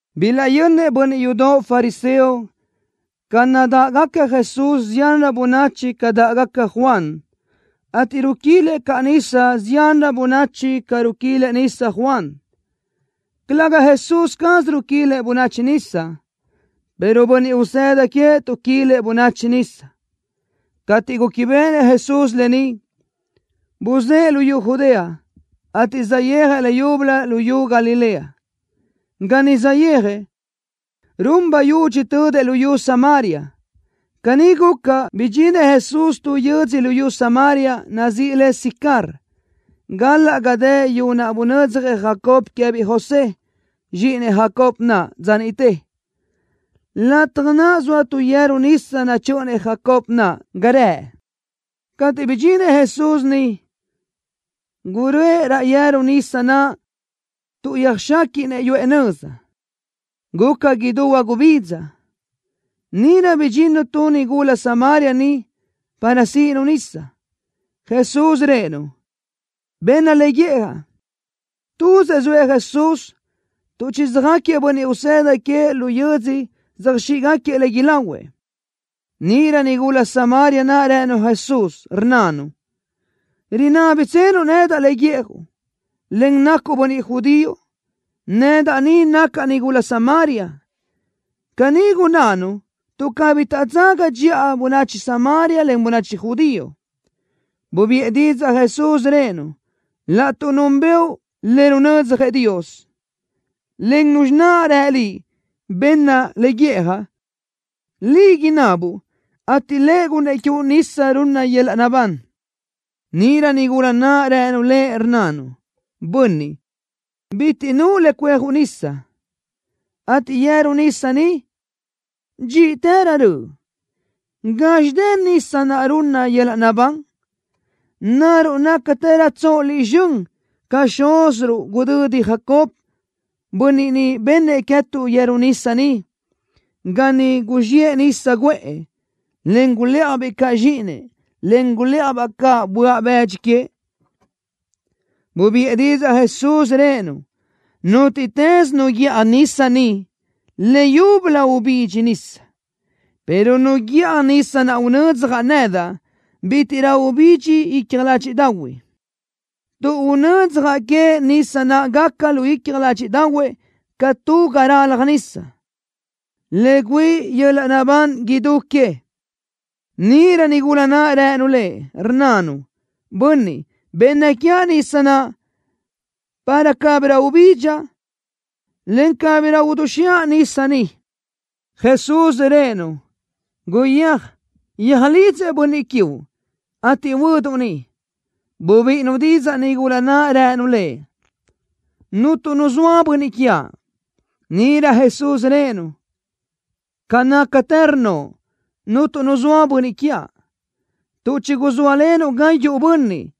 Bilaʼyönnëʼ bönniʼ yudoʼ fariseo ca naʼ dáʼgaca Jesús ziánrö bönachi ca dáʼgaca Juan, ateʼ ruquilëʼ caʼ nisa ziánrö bönachi ca ruquilëʼ nisa Juan. Calëga Jesús caz ruquilëʼ bönachi nisa, pero bönniʼ usëda queëʼ tuʼquilëʼ bönachi nisa. Cateʼ gúquibeʼenëʼ Jesús lë ni, buzë́ʼë luyú Judea, ateʼ saʼyéajëʼ leyúbölö luyú Galilea. Ga niʼ saʼyéajëʼ, run bayudxi tödëʼ luyú Samaria. Caní guca, bidxinëʼ Jesús tu yö́dzödoʼ luyú Samaria, nazíʼi le Sicar, galaʼ ga dë yu naʼ bunödzjëʼ Jacob queë́biʼ José, zxíʼinëʼ Jacob naʼ, dza niʼte. Lataj naʼ zoa tu yeru nisa nachö́ʼönëʼ Jacobo naʼ ga rëʼ. Cateʼ bidxinëʼ Jesús niʼ, guröʼë raʼ yeru nisa naʼ tuʼ yöjxéquiʼnëʼ yuʼë nöza. Guca idú huagubidza. Níʼirö bidxinnu tu nigula Samaria niʼ para síʼinu nisa. Jesús rëʼë-nu: —Benna le guíʼjaʼ. Tuzëʼ zoëʼ Jesús tuʼ chisöjáquiëʼ bönniʼ usëda queëʼ lu yödzö söjxíʼgaquiëʼ le ilahuëʼ. Níʼirö nigula Samaria naʼ rënu Jesús, rnnanu: —¿Rinábitsenuʼ nedaʼ le guíʼjuʼ, en nacuʼ bönniʼ judío? Nedaʼ ni nacaʼ nigula Samaria. Caní gunnánu tuʼ cabí taʼdzaga dxiʼa bönachi Samaria len bönachi judío. Bubiʼë didzaʼ Jesús, rëʼë-nu: —Laʼtuʼ núnbëʼu le runödzjëʼ Dios, en Nuzxi naʼ rë liʼ: “Benna le guiʼjaʼ”, liʼ inabuʼ, ateʼ Lëʼ gunnëʼ quiuʼ nisa runna yöl-laʼ naʼbán. Níʼirö nigula naʼ rënu Lëʼ, rnnanu: —Bönniʼ, bitiʼ nuʼu le cuéajuʼ nisa, ateʼ yeru nisa ni, dxíʼtërö röʼ. ¿Gazxi dë nisa naʼ runna yöl-laʼ naʼbán? ¿Naruʼ nácatërötsoʼ Liʼ zxön ca xúziruʼ gudödi Jacob, bönniʼ niʼ bennëʼ queë́tuʼ yeru nisa ni, ga ni guzxiʼë nisa guʼë, en gulë́ʼajbiʼ caʼ zxíʼinëʼ, en gulë́ʼajbaʼ caʼ böaʼ bëdxi queëʼ? Bubiʼë didzaʼ Jesús, rëʼë-nu: —Nútiʼtës nu guíʼaj nisa ni, leyúbölö ubidxi nisa, pero nu guíʼaj nisa naʼ unödzjaʼ nedaʼ, bítiʼrö ubidxi icja ládxiʼdaʼahuëʼ, tuʼ unödzjaʼ queëʼ nisa naʼ gaca lu icja ládxiʼdaʼahuëʼ ca tu ga ralaj nisa, le güíʼi yöl-laʼ naʼbán idú queëʼ. Níʼirö nigula naʼ rënu Lëʼ, rnnanu: —Bönniʼ, benna quiaʼ nisa naʼ, para cabirö ubidxaʼ, en cabirö uduzxiʼa nisa ni. Jesús rëʼë-nu: —Guyéaj, yöjlidzëʼ bönniʼ quiuʼ, ateʼ huöduʼ ni. Bubíʼinu didzaʼ nigula naʼ, rënu Lëʼ: —Cuntu nu zoa bönniʼ quiaʼ. Níʼirö Jesús rëʼë-nu: —Ca nácatë rnnoʼ: “Cuntu nu zoa bönniʼ quiaʼ”, tuʼ chiguzóalenuʼ gayuʼ bönniʼ,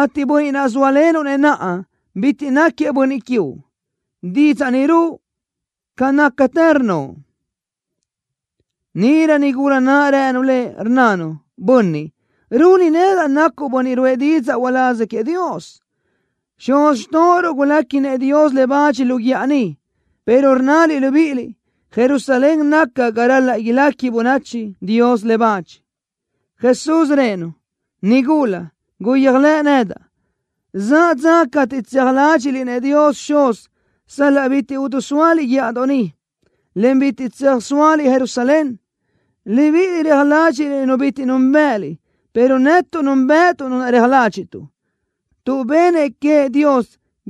ateʼ bönniʼ naʼ zóalenuʼ-nëʼ naʼa, bitiʼ náquiëʼ bönniʼ quiuʼ. Didzaʼ ni ruʼu, ca nácatë rnnoʼ. Níʼirö nigula naʼ rënu Lëʼ, rnnanu: —Bönniʼ, runi nedaʼ nacuʼ bönniʼ ruʼë didzaʼ uláz queëʼ Dios. Xuz xtóʼoruʼ guléquinëʼ Dios le bach lu guíʼa ni, pero rnnaliʼ libíʼiliʼ Jerusalén naca ga ral-laʼ ilequi bönachi Dios le bach. Jesús rëʼë-nu: —Nigula, guyéajlëʼ nedaʼ. Zaʼ dza cateʼ tseaj ládxiʼliʼ-nëʼ Dios Xuz sal-laʼ bitiʼ idisóaliʼ guíʼadoʼ ni, en bitiʼ tsöjsóaliʼ Jerusalén. Libíʼiliʼ reaj ládxiʼliʼ Nu bitiʼ núnbëʼëliʼ, pero netuʼ núnbëʼëtuʼ Nu naʼ reaj ládxiʼtuʼ, tuʼ benëʼ queëʼ Dios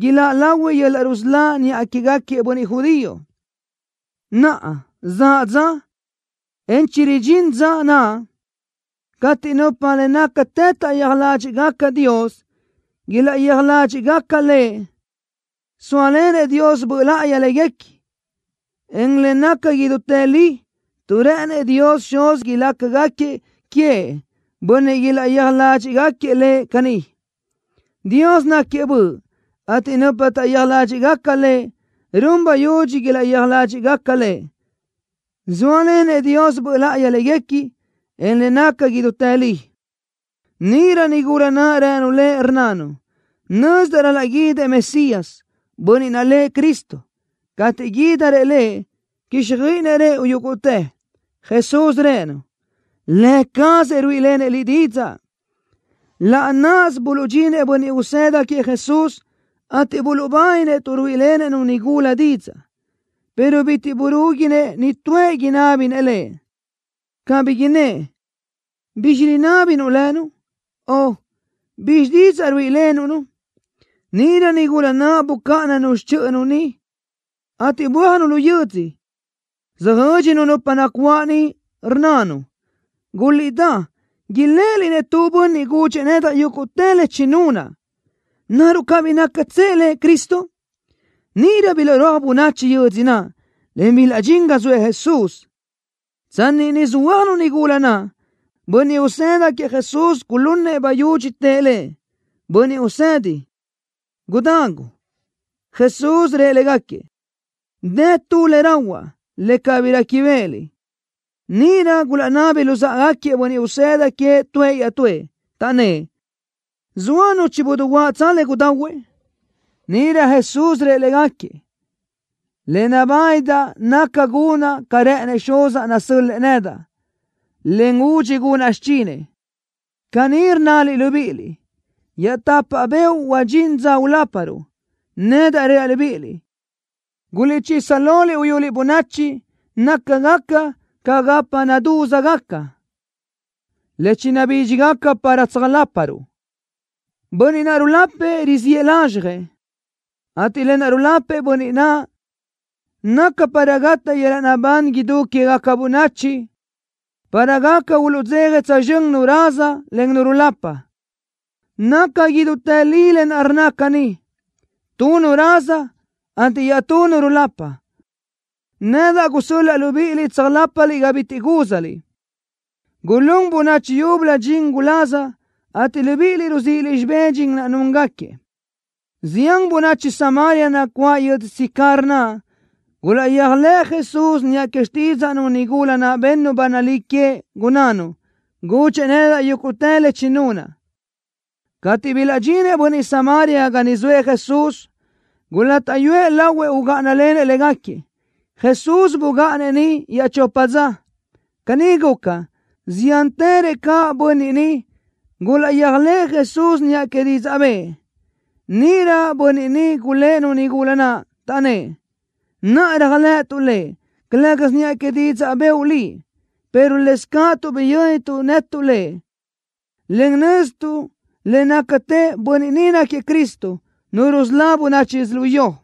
iláʼ lahui yöl-laʼ rusölá niʼa quégaquiëʼ bönniʼ judío. Naʼa, zaʼ dza, en chiridxín dza naʼ, cateʼ nupa le nácatë taʼyéaj ládxiʼgaca Dios, ilaʼyéaj ládxiʼgaca Lëʼ, zóalenëʼ Dios Böʼ Láʼayi léguequi, en le naca idútë li, tuʼ rë́ʼënëʼ Dios Xuz ilácagaquiëʼ queëʼ bönniʼ ilaʼyéaj ládxiʼgaquiëʼ Lëʼ caní. Dios náquiëʼ Böʼ, ateʼ nupa taʼyéaj ládxiʼgaca Lëʼ, run bayudxi ilaʼyéaj ládxiʼgaca Lëʼ, zóalenëʼ Dios Böʼ Láʼayi léguequi, en le naca idútë li. Níʼirö nigula naʼ rënu Lëʼ, rnnanu: —Nözdaʼ ral-laʼ guídëʼ Mesías, Bönniʼ naʼ lëʼ Cristo. Cateʼ guídirëʼ Lëʼ quíxjöiʼinëʼ rëʼu yúguʼtë. Jesús rëʼë-nu: —Lë cazëʼ ruíʼilenëʼ liʼ didzaʼ. Laʼ náʼasö buluʼdxinëʼ bönniʼ usëda queëʼ Jesús, ateʼ buluʼbáninëʼ tuʼ ruíʼilenëʼ-nu nigula didzaʼ, pero bitiʼ burúguinëʼ nitúëʼ inábinëʼ Lëʼ, cabí innë́ʼ: “¿Bizxi rinábinuʼ lënu?” o: “¿Bizxi didzaʼ ruíʼilenuʼ-nu?” Níʼirö nigula naʼ bucáʼananu xichöʼönu niʼ, ateʼ bö́ajnu laʼ yödzö, söjö́dxinu nupa nacuáʼ niʼ, rnnanu: —¡Guliʼdá, iléʼeliʼ-nëʼ tu bönniʼ gudxëʼ nedaʼ yúguʼtë le chinunaʼ! ¿Naruʼ cabí nácatsëʼ Lëʼ Cristo? Níʼirö bilaʼrúaj bönachi yödzö naʼ, en bilaʼdxín ga zoëʼ Jesús. Tsanni niʼ söhuö́ajnu nigula naʼ, bönniʼ usëda queëʼ Jesús gulunëʼ bayudxi, tëʼ Lëʼ: —Bönniʼ Usedi, gudagu. Jesús rëʼ légaquiëʼ: —Dë tu le rahuaʼ, le cabí réquibeʼeliʼ. Níʼirö gulaʼnabi luzáʼagaquiëʼ bönniʼ usëda queëʼ tuëʼ iaʼtúëʼ, taʼnnë́ʼ: —¿Zoa nu chidiguáʼtsö le gudahuëʼ? Níʼirö Jesús rëʼ légaquiëʼ: —Le nabánidaʼ naca gunaʼ ca rë́ʼënëʼ Xuzaʼ nasö́l-lëʼë nedaʼ, en údxi gunaʼ xichinëʼ. Caní rnnaliʼ libíʼiliʼ: “Iaʼtapa beoʼ huadxín dza uláparuʼ.” Nedaʼ reaʼ libíʼiliʼ: Guliʼchisa loliʼ uyuliʼ bönachi nácagaca ca gapa nadúzgaca, le chinabídxigaca para tsöjláparuʼ. Bönniʼ naʼ rulapëʼ riziʼë lazxjëʼ, ateʼ lë naʼ rulapëʼ bönniʼ naʼ, naca para gataʼ yöl-laʼ naʼbán idú quégaca bönachi, para gaca uluʼdzeja tsözxö́n nu raza, en nu rulapa. Naca idútë li lë naʼ rnna caní: Tu nu raza, ateʼ iaʼtú nu rulapa. Nedaʼ gusö́l-laʼa libíʼiliʼ tsöjlápaliʼ ga bitiʼ gúzaliʼ. Gulún bönachi yúbölö dxin guláz, ateʼ libíʼiliʼ ruzíʼiliʼ xibé dxin naʼ núngaquiëʼ. Zián bönachi Samaria nacuáʼ yödzö Sicar naʼ gulaʼyéajlëʼë Jesús niʼa que xtídzaʼnu nigula naʼ bennu ba nalí queëʼ, gunnánu: “Gudxëʼ nedaʼ yúguʼtë le chinunaʼ.” Cateʼ bilaʼdxinëʼ bönniʼ Samaria ga niʼ zoëʼ Jesús, gulátaʼyuëʼ lahuëʼ ugáʼanalenëʼ légaquiëʼ. Jesús bugáʼanëʼ niʼ iaʼchopa dza. Caní guca, ziántërëʼ caʼ bönniʼ niʼ gulaʼyéajlëʼë Jesús niʼa que didzaʼ bëʼë. Níʼirö bönniʼ niʼ gulë́ʼ-nu nigula naʼ, taʼnnë́ʼ: —Naʼa réajlëʼëtuʼ Lëʼ, calë́gasö niʼa que didzaʼ bëʼu liʼ, pero lëscaʼ tuʼ biyö́nituʼ netuʼ Lëʼ, en nöztuʼ le nácatë bönniʼ ni náquiëʼ Cristo, Nu rusölá bönachi yödzölió.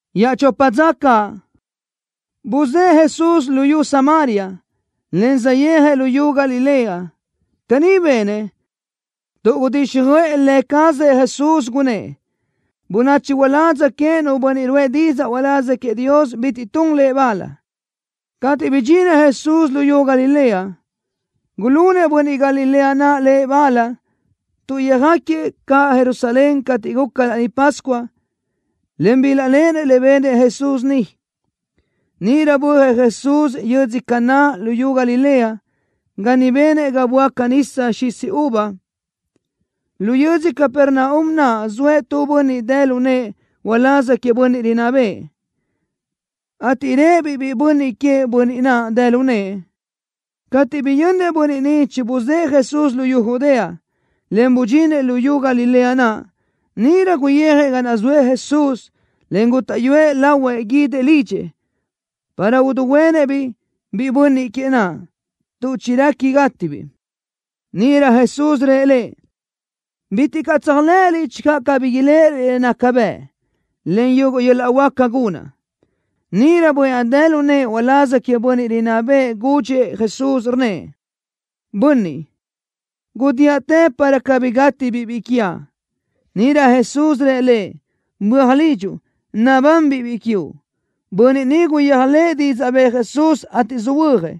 Iaʼchopa dza caʼ, buzë́ʼë Jesús luyú Samaria, en saʼyéajëʼ luyú Galilea. Caní benëʼ, tuʼ gudíxjöʼë Lë cazëʼ Jesús, gunnë́ʼ: “Bönachi uládz queëʼ nu bönniʼ ruʼë didzaʼ uláz queëʼ Dios bitiʼ tun lëʼ bal.” Cateʼ bidxinëʼ Jesús luyú Galilea, gulunëʼ bönniʼ Galilea naʼ Lëʼ bal tuʼ yöjáquiëʼ caʼ Jerusalén cateʼ guca Laní Pascua, en bilaʼléʼenëʼ le benëʼ Jesús niʼ. Níʼirö bö́ajëʼ Jesús yödzö Caná luyú Galilea, ga niʼ benëʼ ga böáca nisa xisi uva. Lu yödzö Capernaum naʼ zoëʼ tu bönniʼ dë lu nëʼë uláz queëʼ bönniʼ rinná bëʼë, ateʼ réʼebiʼ biʼi bönniʼ queëʼ bönniʼ naʼ dë lu nëʼë. Cateʼ biyönnëʼ bönniʼ ni chibuzë́ʼë Jesús luyú Judea, en budxinëʼ luyú Galilea naʼ, níʼirö guyijëʼ ga naʼ zoëʼ Jesús, en gútaʼyuëʼ lahuëʼ guídëʼ lidxëʼ, para uduhuénëʼ-biʼ biʼi bönniʼ queëʼ naʼ, tuʼ chirequi gátibiʼ. Níʼirö Jesús rëʼ lëʼ: —Bitiʼ caʼ tséajlëʼëliʼ channö cabí iléʼeliʼ le nácagaca bëʼ, en yuguʼ yöl-laʼ huáca gunaʼ. Níʼirö bönniʼ naʼ dë lu nëʼë uláz queëʼ bönniʼ rinná bëʼë gudxëʼ Jesús, rnnëʼ: —Bönniʼ, gudíaʼtë para cabí gátibiʼ biʼi quiaʼ. Níʼirö Jesús rëʼ lëʼ: —Böaj lidxuʼ. Nabanbiʼ biʼi quiuʼ. Bönniʼ ni guyéajlëʼë didzaʼ bëʼë Jesús, ateʼ söhuö́jëʼ.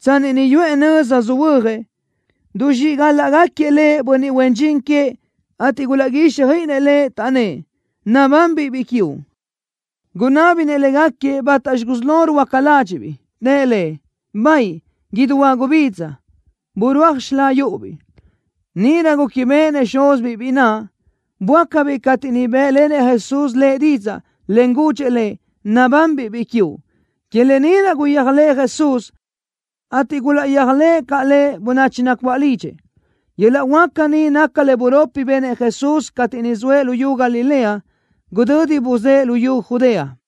Tsanni niʼ yuʼë nöza söhuö́jëʼ, duzxíʼgalaʼgaquiëʼ lëʼ bönniʼ huen dxin queëʼ ateʼ gulaʼguíxjöiʼinëʼ lëʼ, taʼnnë́ʼ: —Nabanbiʼ biʼi quiuʼ. Gunábinëʼ légaquiëʼ bátaxi gusí lo ruhuöáca ládxiʼbiʼ. Tëʼ lëʼ: —Baʼayi, idú huagubidza, burúaj xilá yúʼubiʼ. Níʼirö gúquibeʼenëʼ xúzibiʼ biʼi naʼ, böácabiʼ cateʼ niʼ bë́ʼlenëʼ Jesús lëʼ didzaʼ, en gudxëʼ lëʼ: “Nabanbiʼ biʼi quiuʼ.” Que lë ni naʼ guyéajlëʼë Jesús, ateʼ gulaʼyéajlëʼ caʼ Lëʼ bönachi nacuáʼ lidxëʼ. Yöl-laʼ huáca ni naca le buropi benëʼ Jesús cateʼ niʼ zoëʼ luyú Galilea, gudödi buzë́ʼë luyú Judea.